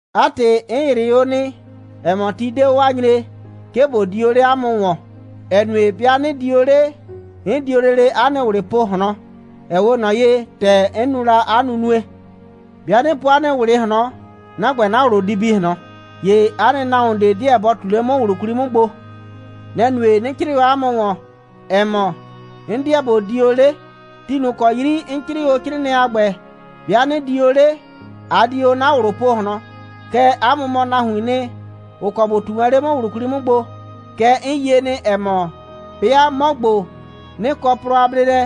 'A ‑tɩ, 'n ‑yrɩ o nɩ, ‑ɛ mɔ, ti 'de o a nyree, 'ke ꞊bo di o 'le 'a mʋ ‑wɔn, ‑ɛ nue, 'bɩa 'nɩ di o 'le, 'n di o lele 'a nɩ ꞊wlɩ po ꞊hlɔn, ‑ɛ 'we ꞊nɔ ye, ‑tɛ 'n nu la 'a nunue. 'Bɩa 'nɩ po 'a nɩ ꞊wlɩ ꞊hlɔn, 'na ‑gbɛ, 'na ꞊wlʋ di bi ꞊hlɔn. ‑Ye 'a nɩ nahuon ꞊de 'deɛ bɔ ꞊tu 'le 'mʋ ꞊wlʋ 'kwli 'mʋ gbo. Nɛ‑ nue, 'nɩ 'crɩɩ o 'a mʋ ‑wɔn, ‑ɛ mɔ, 'n 'deɛ ꞊bo di o 'le. Ti ꞊nʋ ‑kɔ 'yri 'n 'crɩɩ o 'crɩɩnɩɛ a ‑gbɛ, 'bɩa 'nɩ di o 'le, a di o 'na ꞊wlʋ po ꞊hlɔn. Kɛɛ, 'a mʋ mɔ nahuiin nɩ, ‑ʋ kɔ ‑bʋ ꞊tu wɛn 'le 'mʋ ꞊wlʋ 'kwli 'mʋ gbo. Kɛɛ, 'n yie nɩ, ‑ɛ mɔ, 'bɩa 'mɔ ‑gbo, 'nɩ kɔ plɔ a bleelɛ,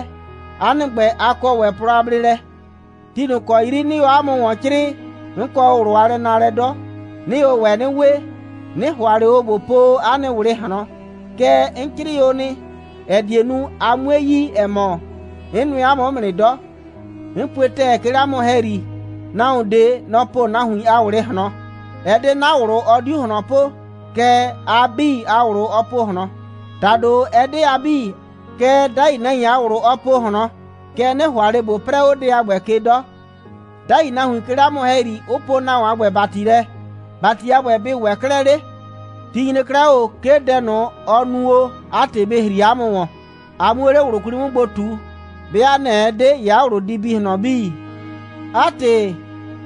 'a nɩ ‑gbɛ, a kɔ ‑wɛ plɔ a bleelɛ. Ti ꞊nʋ ‑kɔ 'yri 'nɩɩ o 'a mʋ ‑wɔn 'crɩɩ, 'n kɔ o ꞊wlʋ a lɛnaalɛ 'dɔ. 'Nɩɩ o ‑wɛ 'nɩ we. 'Nɩ ‑hʋa ꞊le o ꞊bo po o 'a nɩ ꞊wlɩ ꞊hlɔn. Kɛɛ, 'n 'crɩɩ o nɩ, ‑ɛ die nu, a 'mue yi, ‑ɛ mɔ, 'n nʋɛ 'a mʋ 'mʋ nɩ 'dɔ. 'N pue ‑tɛɛ, 'ke 'le 'a mʋ ‑hɛyri, nahuon ꞊de, nɔ‑ po nahuin a ꞊wlɩ ꞊hlɔn. Ɛ 'de 'na ꞊wlʋ, ɔ 'diu ꞊hlɔn po, kɛɛ, a 'bii a ꞊wlʋ ɔ po ꞊hlɔn. ‑Tado, ɛ 'de a 'bii, kɛɛ, 'dai nahuin a ꞊wlʋ ɔ po ꞊hlɔn. Kɛɛ, 'nɩ ‑hʋa ꞊le ꞊bo 'prɛɛ 'o dɛ a ‑gbɛ ke 'dɔ; 'dai nahuin 'ke 'le 'a mʋ ‑hɛyri, 'ʋ poo nahuon a ‑gbɛ ‑bati lɛ. ‑Bati a ‑gbɛ, bɩ ‑wɛ 'klɛɛ 'le. Ti nyre 'klɛɛ 'o ꞊o, 'ke dɛ ꞊nʋ, ɔ nu o, 'a ‑tɩ bɩ ‑hri 'a mʋ ‑wɔn, a 'muo 'le ꞊wlʋ 'kwli 'mʋ gbo ꞊tu. 'Bɩa nɛ‑ ɛ 'de, ‑ye 'a ꞊wlʋ di bi ꞊hlɔn 'bii. 'A ‑tɩ,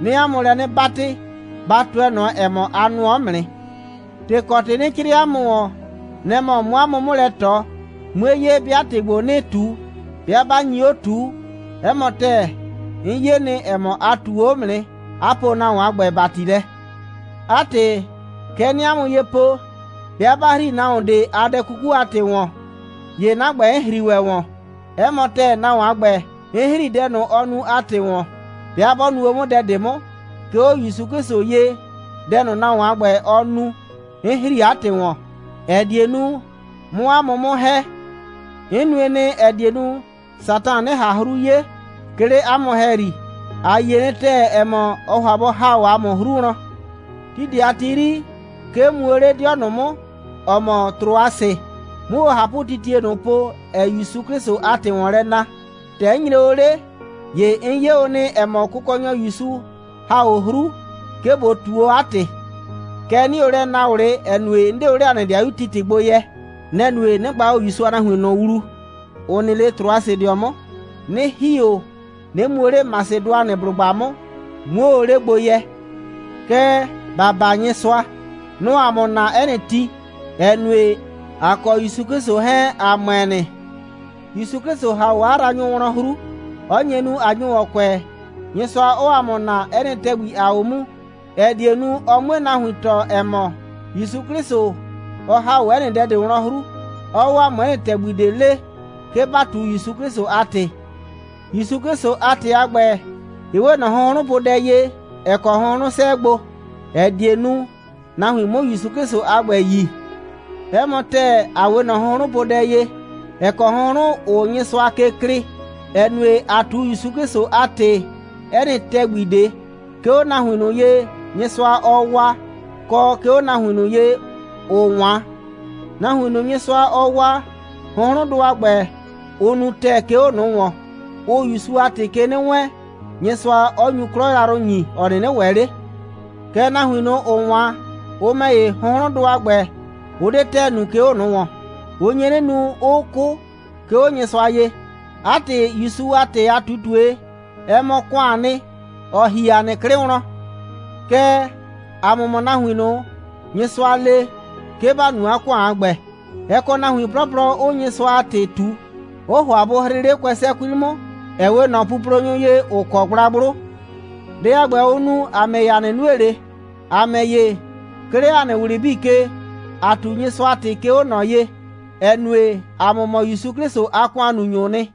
'nɩɩ 'a mʋ lɛ 'nɩ 'batɩ, ba tʋɛ ꞊nɔ, ‑ɛ mɔ, a nʋɔ 'mʋ nɩ. ‑Tɩ kɔ ‑tɩ 'nɩ 'crɩɩ o 'a mʋ ‑wɔn, nɛ‑ mɔ, 'mʋ 'a mʋ 'mʋ lɛ ꞊tɔ, 'mue 'ye, 'bɩa ‑tɩ ‑gbo 'nɩɩ ꞊tu, 'bɩa 'ba nyi 'o ꞊tuu. 'Ɛ mɔ ‑tɛɛ, 'n 'ye nɩ, ‑ɛ mɔ, a ꞊tuu 'o 'mʋ nɩ, 'a poo nahuon a ‑gbɛ ‑bati lɛ. 'A ‑tɩ, kɛ 'nɩɩ 'a mʋ ye po, 'bɩa 'ba ‑hri nahuon ꞊de a dɛ 'kuku a ‑tɩ ‑wɔn, ‑ye 'na ‑gbɛ, 'n ‑hri ‑wɛ ‑wɔn. 'Ɛ mɔ ‑tɛɛ, nahuon a ‑gbɛ, 'n ‑hri dɛ ꞊nʋ, ɔ nu a ‑tɩ ‑wɔn, 'bɩa 'bɔ nu o 'mʋ dɛ ꞊de 'mʋ. 'Ke 'o ‑Yusu 'Klɩsʋ ye, dɛ ꞊nʋ, nahuon a ‑gbɛ, ɔ nu, 'n ‑hri 'a ‑tɩ ‑wɔn, ‑ɛ die nu, 'mʋ 'a mʋ 'mʋ ‑hɛ. 'N nue nɩ, ‑ɛ die nu, Satan 'nɩ ꞊han 'hru 'ye, 'ke 'le ‑a mʋ ‑hɛyri. ‑A yie nɩ ‑tɛɛ, ‑ɛ mɔ, ɔɔ ‑hʋa bɔ ‑ha 'o ‑a mʋ 'hru wlɔn. Ti ꞊de a ti 'yri, 'ke 'n mu o 'le 'dɩɔ ꞊nʋ 'mʋ, ‑ɔ mɔ Trʋasɩ, 'mʋ o ꞊hapʋtitie ꞊nʋ po, ‑ɛɛ ‑Yusu 'Klɩsʋ a ‑tɩ ‑wɔn lɛ na. ‑Tɛ 'n nyre o 'le, ‑ye 'n 'ye o nɩ, ‑ɛ mɔ, Kʋkɔnyɔ ‑Yusu ‑ha o 'hru, 'ke ꞊bo ꞊tu o 'a ‑tɩ. Kɛɛ, 'nɩɩ o lɛ naa ꞊wlɩ, ‑ɛ nue, 'n 'de o 'le ‑a nɩ 'dɩayu Titɩ gbo yɛ. Nɛ‑ nue, 'nɩ gba o ‑Yusu a nahuin ꞊nʋ wlu, ‑ʋ nɩ 'le Trʋasɩdɩɔ 'mʋ, 'nɩ ‑hi o, 'nɩ mu o 'le Masɩdʋanɩblʋgba 'mʋ, 'muo o 'le gbo yɛ. Kɛɛ, ‑ba baa Nyɩsʋa. Nɔ‑ɔ ‑a mʋ naa 'ɛ nɩ ti, ‑ɛ nue, ‑a kɔ ‑Yusu 'Klɩsʋ 'hɛɛn, ‑a ‑mʋɛ nɩ. ‑Yusu 'Klɩsʋ ‑ha 'o 'a yraanyʋ wlɔn 'hru, 'ɔ nye nu, ꞊a nyo ‑wɔn kʋɛ, Nyɩsʋa 'ɔɔ ‑a mʋ naa 'ɛ nɩ ‑tɛgbi, ‑aa 'o mu, ‑ɛ die nu, ɔ 'mue nahuin tɔɔ, ‑ɛ mɔ, ‑Yusu 'Klɩsʋ, ɔ ‑ha 'o 'ɛ nɩ dɛ ꞊de wlɔn 'hru, 'ɔɔ 'o ‑a mʋ 'ɛ nɩ ‑tɛgbi ꞊de lee, 'ke ‑ba ꞊tu ‑Yusu 'Klɩsʋ a ‑tɩ. ‑Yusu 'Klɩsʋ a ‑tɩ a ‑gbɛ, ɩ 'we ꞊nɔ hʋnhrʋnpodɛ ye, ‑ɛ kɔ hʋnhrʋn 'sɛɛ gbo, ‑ɛ die nu, nahuin 'mʋ ‑Yusu 'Klɩsʋ a ‑gbɛ yi. 'Ɛ mɔ ‑tɛɛ, ‑a 'we ꞊nɔ hʋnhrʋnpodɛ ye, ‑ɛ kɔ hʋnhrʋn, ʋʋ Nyɩsʋa ke klɩɩ, ‑ɛ nue, ‑aa ꞊tu ‑Yusu 'Klɩsʋ a ‑tɩ, 'ɛ nɩ ‑tɛgbi ꞊de, 'ke 'o nahuin ꞊nʋ ye, Nyɩsʋa, ɔɔ waa, kɔ 'ke 'o nahuin ꞊nʋ ye, ‑ʋʋ 'wan. Nahuin ꞊nʋ, Nyɩsʋa, ɔɔ waa, hʋnhrʋndʋ a ‑gbɛ, ʋ nu ‑tɛɛ, 'ke 'o ꞊nʋ ‑wɔn. Ʋʋ ‑Yusu a ‑tɩ ke 'nɩ wɛɛn, Nyɩsʋa 'ɔ nyu 'klɔ yrayrʋ ‑nyi, ‑ɔ 'nɩnɩ ‑wɛ 'le. Kɛɛ, nahuin ꞊nʋ, ‑ʋʋ 'wan, ʋ ‑mɛ ‑ye, hʋnhrʋndʋ a ‑gbɛ, ʋ 'de ‑tɛɛ nu, 'ke 'o ꞊nʋ ‑wɔn, 'ʋ nye nu, 'ʋʋ 'kʋ, 'ke 'o Nyɩsʋa ye. 'A ‑tɩ, ‑Yusu a ‑tɩ a ꞊tutue, ɛ mɔ ‑kʋaan nɩ, ‑ɔ ‑hi ‑a nɩ 'klɩ wlɔn. Kɛɛ, ‑a mʋ mɔ nahuin ꞊nʋ, Nyɩsʋa le, 'ke ‑ba nu ‑kʋan a ‑gbɛ. Ɛ kɔ nahuin 'plɔplɔ, 'ʋʋ Nyɩsʋa a ‑tɩ ꞊tu, 'ʋʋ ‑hʋa bʋ hrɩɩ 'le kʋɛsɛ 'kwli 'mʋ, ‑ɛ 'we ꞊nɔ puplonyʋ ye, ‑ʋ kɔ gblagblʋ. Dɛ a ‑gbɛ, ʋʋ nu, ‑a ‑mɛ ‑ye, ‑a 'nɩ nue ꞊le. ‑A ‑mɛ ‑ye, 'ke 'le ‑a nɩ ꞊wlɩ 'bii ke, ‑aa ꞊tu Nyɩsʋa a ‑tɩ, 'ke 'o ꞊nɔ ye, ‑ɛ nue, ‑a mʋ mɔ ‑Yusu 'Klɩsʋ a ‑kʋannunyʋʋ nɩ.